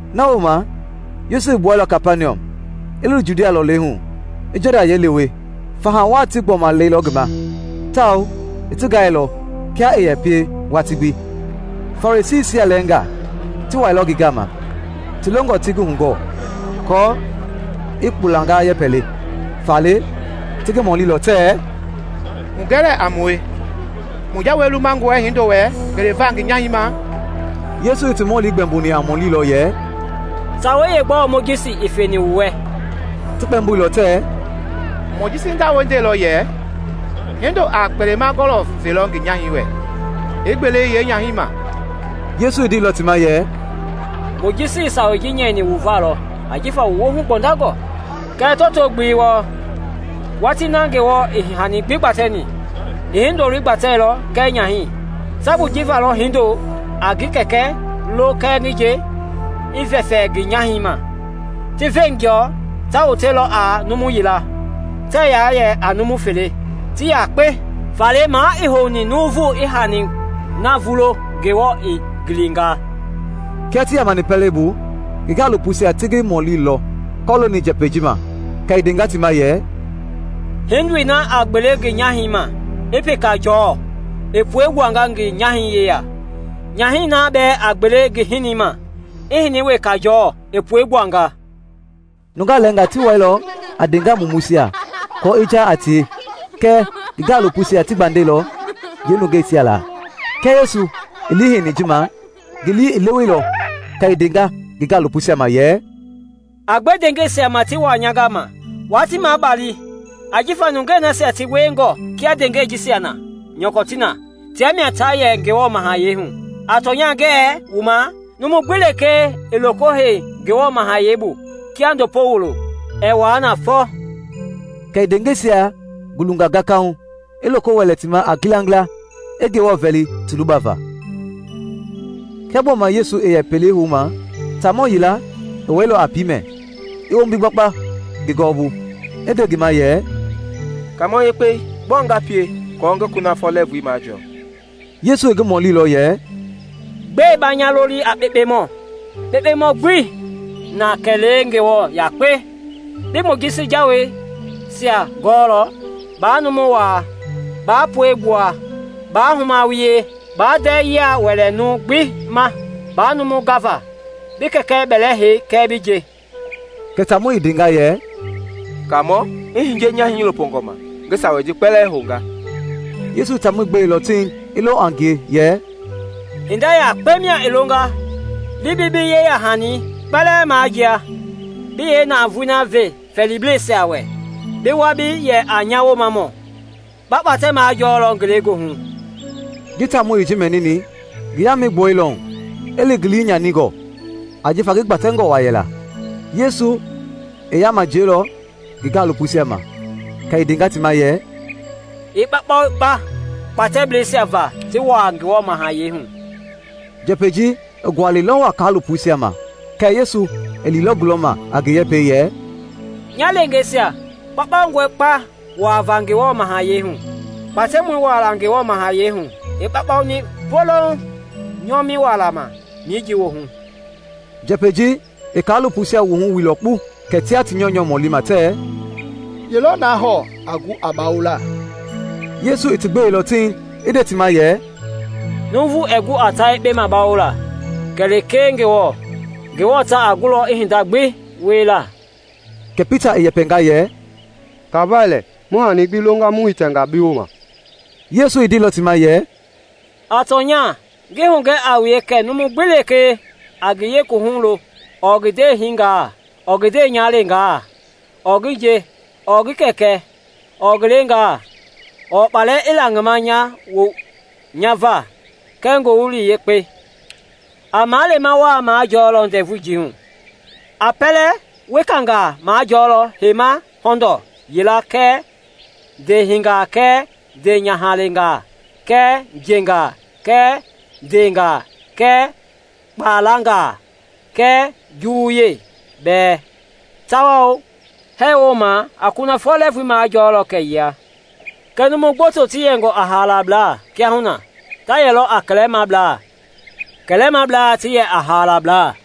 Na wooma Yesu i gbuɛilɔ Kapaniɔm i li Judia lɔlei hu, i Jɔdan yɛi lewe. Faha wa ti gbɔma lɛilɔ ngi ma tawao i ti gaailɔ kia i yɛ pie watii gbi. Farisiisia lɛɛngaa ti wailɔ ngi gama, ti longɔ ti ngi hugɔɔ aako i kpulanga yɛpɛ le. Faale ti ngi mɔlilɔ tɛɛ, “Hugɛ lɛɛ a mue, mu jawei lumangɔe hindo wɛ gbeleva ngi nyahɛi ma?” Yesu i ti mɔli gbɛmboni a mɔli lɔ yɛ, “Sawei yeegbɔɔ Mojisi i feni wu wɛ?” Ti kpɛmboilɔ tɛɛ, “Mojisi jawei ndeilɔ yɛ hindoi a kpelema-gɔlɔ velɔ ngi nyahɛi wɛ i gbele yeenyahɛi ma.” Yesu i ndeilɔ ti ma yɛ, “Mojisi i sawei ji nyɛini wu va lɔ ajifa wu woohu gbɔndangɔ. Kɛɛ tɔto-gbelei wɔɔ, watii na Ngewɔ i hani gbi gbatɛni, i hindoi gbateilɔ kɛɛ nyahɛi. Sabui ji va lɔ hindo a ngi kɛkɛ lo kɛɛ ngi nje, i vɛfɛ ngi nyahɛi ma. Ti veenjɔ ta wotelɔ a numu yila. Tɛɛ yaa yɛ a numu fele, ti yakpe. Faale maa ii houni nuuvu i hani na vulo Ngewɔ i ngilinga.” Kia ti yamani pɛlei bu, ngi gaalopoisia ti ngi mɔlilɔ kɔlooni njɛpɛi ji ma. Kɛ i ndenga ti ma yɛ, “Hindoi na a gbele ngi nyahɛi ma, i peka jɔɔ, i puegbuanga ngi nyahɛi yeya. Nyahɛi na bɛɛ a gbele ngi hinii ma, i hini weka jɔɔ, i puegbuanga.” Nungaa lɛɛngaa ti wailɔ a ndeengaa mumuisia aako i jaa a tie kɛɛ ngi gaalopoisia ti gbandɛilɔ yeenungeisia la. Kia Yesu i liiheini ji ma, ngi lii i leweilɔ, kɛ i ndenga ngi gaalopoisia ma yɛ, “A gbe ndeengɛisia ma ti waa nya gama, waa ti mabali, ajifa nungei nasia ti wiengɔ kia ndeengɛi jisia nyɔkɔ ti na, tia mia ta yɛ Ngewɔ mahayɛi hu. A tɔnya, ngɛɛ wu ma, numu gbi lekee ɛɛ loko hei Ngewɔ mahayɛi bu kia ndopo wulo, ɛɛ wua na fɔ.” Kɛ i ndeengɛisia gulunga gakahu, i loko wɛlɛ ti ma a ngilangila, i Ngewɔ vɛli ti lubava. Kia gbɔma Yesu i yɛ pelei houma, taamɔ yila i wailɔ a piimɛ, i wombi gbakpa ngi gɔwɔbu, i nde ngi ma yɛ, “Kaamɔ yekpei, gbɔɔ nga pie aako ngi kunafɔ lɛɛvui majɔɔ?” Yesu i ngi mɔlilɔ yɛ, “Gbɛe ba nya loli a kpekpemɔ? Kpekpemɔ gbii na kɛlee Ngewɔ yakpe. Bi Mojisi jaweisia gɔɔlɔ; ‘Baa numu wa, baa puegbua, baa huma wie, baa ndɛɛ yia wɛlɛ numu gbi ma, baa numu gava, bi kɛkɛ bɛlɛhei kɛɛ bi nje.’” Kɛ taamɔi i ndenga yɛ, “Kaamɔ, i hiye nya hiilopongɔ ma, ngi sawei ji kpɛlɛɛ hounga.” Yesu i taamɔi gbeilɔ tiŋ, i lo a ngie, yɛ, “Hinda yakpe mia i longa. Li bi bi yeya-hani kpɛlɛɛ majia, bi yeenavoei ve fɛɛliblɛisia wɛ, bi wa bi yɛ a nya Woomamɔ; ba kpatɛ majɔlɔ ngelegoohu.” Ji taamɔi i ji mɛnini, ngi yaamɛi i gbolilɔ hu, i li ngi lii nyaningɔ, ajifa ngi gbatɛngɔ wa yɛla. Yesu i yaama jiɛilɔ ngi gaalopoisia ma, kɛ i ndenga ti ma yɛ, “A kpaukpau kpa kpatɛbleisia va ti wua Ngewɔ mahayɛi hu!” Njɛpɛi ji i gualɛilɔ wa kaalopoisia ma kɛɛ Yesu i liilɔ gulɔma a ngi yɛpɛi yɛ, “Nya leengeisia, kpaukpaungɔe kpa wuava Ngewɔ mahayɛi hu! Kpatɛmɔi wuala Ngewɔ mahayɛi hu i kpaukpauni poloŋ nyɔmɛi wuala ma mijii woohu.” Njɛpɛi ji i kaalopoisia wuhu wuilɔ kpu, kɛ tia ti nyɔunyɔ mɔlima tɛɛ, “Yee lɔ na hɔɔ a gu a bawola?” Yesu i ti gbeilɔ tiŋ i nde ti ma yɛ, “Nuuvu ɛɛ gu a ta yekpe bawola kɛlee Ngewɔ, Ngewɔ ta a gulɔ a hinda gbi wiela.” Kɛ Pita i yɛpɛnga yɛ, “Kafai lɛ, mu hani gbi longa mu hitɛnga bi wooma.” Yesu i ndeilɔ ti ma yɛ, “A tɔnya, ngi hugɛ a wue kɛ numu gbi lekee a ngi yeekuwuhu lo ɔɔ ngi ndeehinga ɔɔ ngi ndeenyahaleengaa ɔɔ ngi nje ɔɔ ngi kɛkɛ ɔɔ ngi leengaa ɔɔ kpalangaa nya va kɛɛ ngowili yekpei, a maleema wa majɔlɔ ndɛvui ji hu. A pɛlɛ wekangaa majɔɔlɔ heima hɔndɔɔ yila kɛɛ ndeehinga kɛɛ ndeenyahaleengaa kɛɛ njengaa kɛɛ ndeengaa kɛɛ kpalangaa kɛɛ juwuyei bɛɛ; tawao hee wooma a kunafɔ lɛɛvui maajɔɔlɔ kɛyia. Kɛɛ numu gboto ti yɛngɔ a haalablaa kiahuna ta yɛlɔ a kɛlɛmablaa, kɛlɛmablaa ti yɛ a haalablaa.”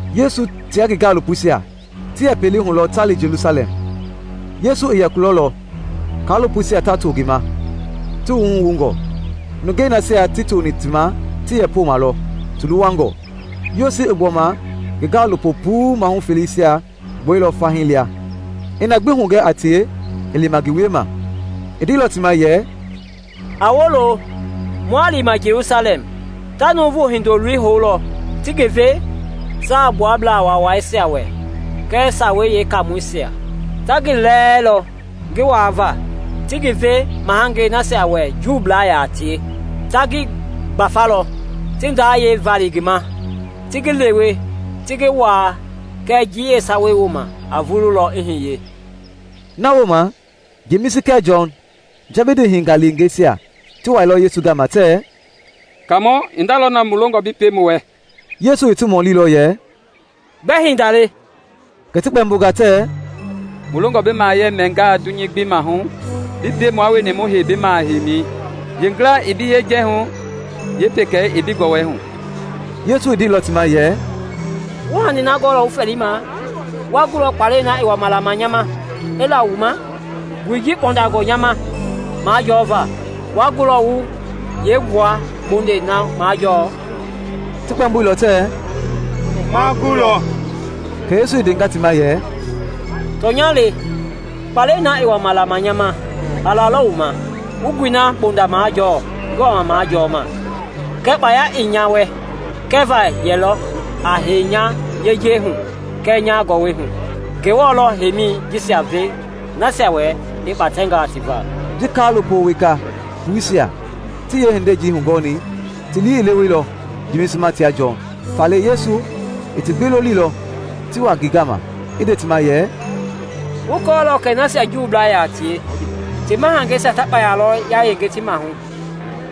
Yesu tia ngi gaalopoisia ti yɛ pelei hu lɔ ta li Jelusalɛm. Yesu i yɛ kulɔ lɔ, kaalopoisia ta to ngi ma, ti wuhu wungɔ; nungei nasia ti toni ti ma ti yɛ poma lɔ ti luwangɔ. Yesu i gbɔma ngi gaalopo puu mahu feleisia gbuɛilɔ fahii lia i na gbi hugɛ a tie i lima ngi wiema. I ndeilɔ ti ma yɛ, “A wolo, mua lima Jelusalɛm. Ta Nuuvu Hindoloi houlɔ ti ngi ve Saagbuablaa Waawaisia wɛ kɛɛ Sawei Yeekaamɔisia. Ta ngi lɛɛlɔ ngi waava, ti ngi ve mahangei nasia wɛ Juublaa yaa tie; ta ngi gbafalɔ, ti ndayɛi vali ngi ma, ti ngi lewe, ti ngi waa. Kɛɛ njii sawa wooma a vululɔ i hiye.” Na wooma Jemisi kɛɛ Jɔn, Jɛbidi hingaleengeisia, ti wailɔ Yesu gama tɛɛ, “Kaamɔ, hinda lɔ na mu longɔ bi pie mu wɛ.” Yesu i ti mɔlilɔ yɛ, “Gbɛ hinda le?” Kɛ ti kpɛmbonga tɛɛ, “Mu longɔ bi mahayɛi mɛngaa dunyei gbi mahu, bi pie mua wueni mu hei bi maha heimi, yeengila i bi yejahu, yeepekei i bi gɔwɔhu.” Yesu i ndeilɔ ti ma yɛ, “Wuii hani na gɔɔ wu fɛɛlima. Wa gulɔ kpalɛi na i wama lama nya ma i la wu ma? Nguɛi ji kpɔndangɔ nya ma majɔva, wa gulɔ wu yeengua bondei na majɔ?” Ti kpɛmboilɔ tɛɛ, “Ma gulɔ.” Kɛ Yesu i ndenga ti ma yɛ, “Tɔnya le, kpalɛi na i wama lama nya ma, a lalɔ wu ma, wu nguɛi na bonda majɔɔ ngi wama majɔɔma. Kɛɛ kpaya ii nya wɛ kɛva ye lɔ a hei nya yejei hu kɛɛ nya gɔwɔ hu! Ngewɔ lɔ a heimi jisia ve nasia wɛ i kpatɛnga ti va.” Ji kaalopo weka puisia ti yeehindei ji hugɔni, ti lii i leweilɔ Jemisi ma tia Jɔn. Faale Yesu i ti gbi lolilɔ ti wa ngi gama, i nde ti ma yɛ, “Wu kɔɔlɔ kɛ nasia Juublaa yaa tie ti mahangeisia ta kpaya lɔ yayenge ti mahu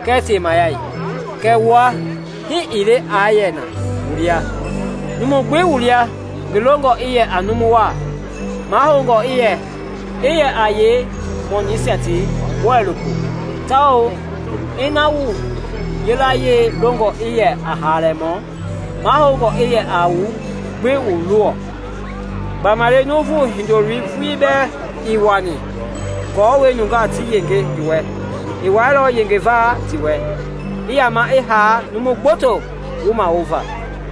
kɛɛ temayɛi. Kɛɛ wua, hii ii le aa yɛ na wu lia. Numu gbi wu lia ngi longɔ i yɛ a numu wa, mahoungɔ i yɛ a yee mɔnisia ti bɔilopo; tawao ina wu yilayee longɔ i yɛ a haalamɔ, mahoungɔ i yɛ a wu gbi wu luwɔ. Gbamaile Nuuvu Hindoloi vulii bɛɛ ii wani aako nungaa ti yenge ngi wɛ; i wailɔ yengeva ti wɛ, i yama i haa numu gboto wumawova.”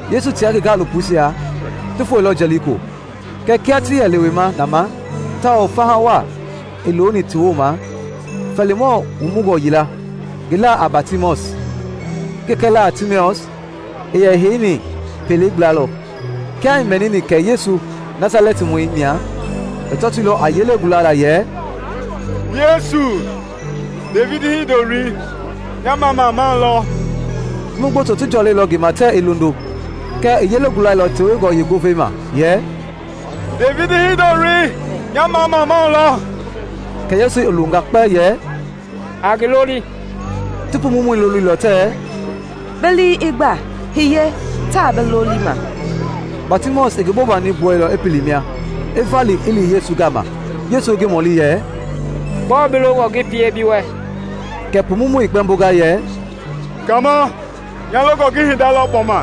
Yesu tia ngi gaalopoisia ti foeilɔ Jɛliko. Kɛɛ kia ti yɛ lewema na ma, tawao faha wa i looni ti wooma, fɛlimɔɔ wumungɔ yila, ngi la a Batimaɔs, ngi kɛkɛ laa a Timius, i yɛ heini pelei gbla lɔ. Kia i mɛnini kɛ Yesu Nasalɛtimɔi mia, i tɔtoilɔ a yelei gulala yɛ, “Yesu, Devidi Hindoloi, nya mamamau lɔ!” Numu gboto ti jɔlɛilɔ ngi ma tɛɛ i londo. Kɛɛ i yelei gulailɔ tewengɔ yeengovei ma yɛ, “Devidi Hindoloi, nya mamamau lɔ!” Kɛ Yesu i longa kpɛ yɛ, “A ngi loli.” Ti pumumɔi lolilɔ tɛɛ, “Bi lii i gba! Hiye, taa bi lolima.” Batimaɔs i ngi bobani gbuɛilɔ i pili mia, i vali i li Yesu gama. Yesu i ngi mɔlilɔ yɛ, “Gbɔɔ bi longɔ ngi pie bi wɛ?” Kɛ pumumɔi i kpɛmbonga yɛ, “Kaamɔ, nya longɔ ngi hinda lɔ gbɔma.”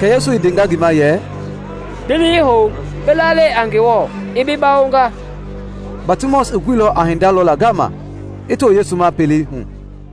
Kɛ Yesu i ndenga ngi ma yɛ, “Li hoe, bi lalɛi a Ngewɔ i bi bawonga.” Batimaɔs i guilɔ a hinda lɔla ngama, i too Yesu ma pelei hu.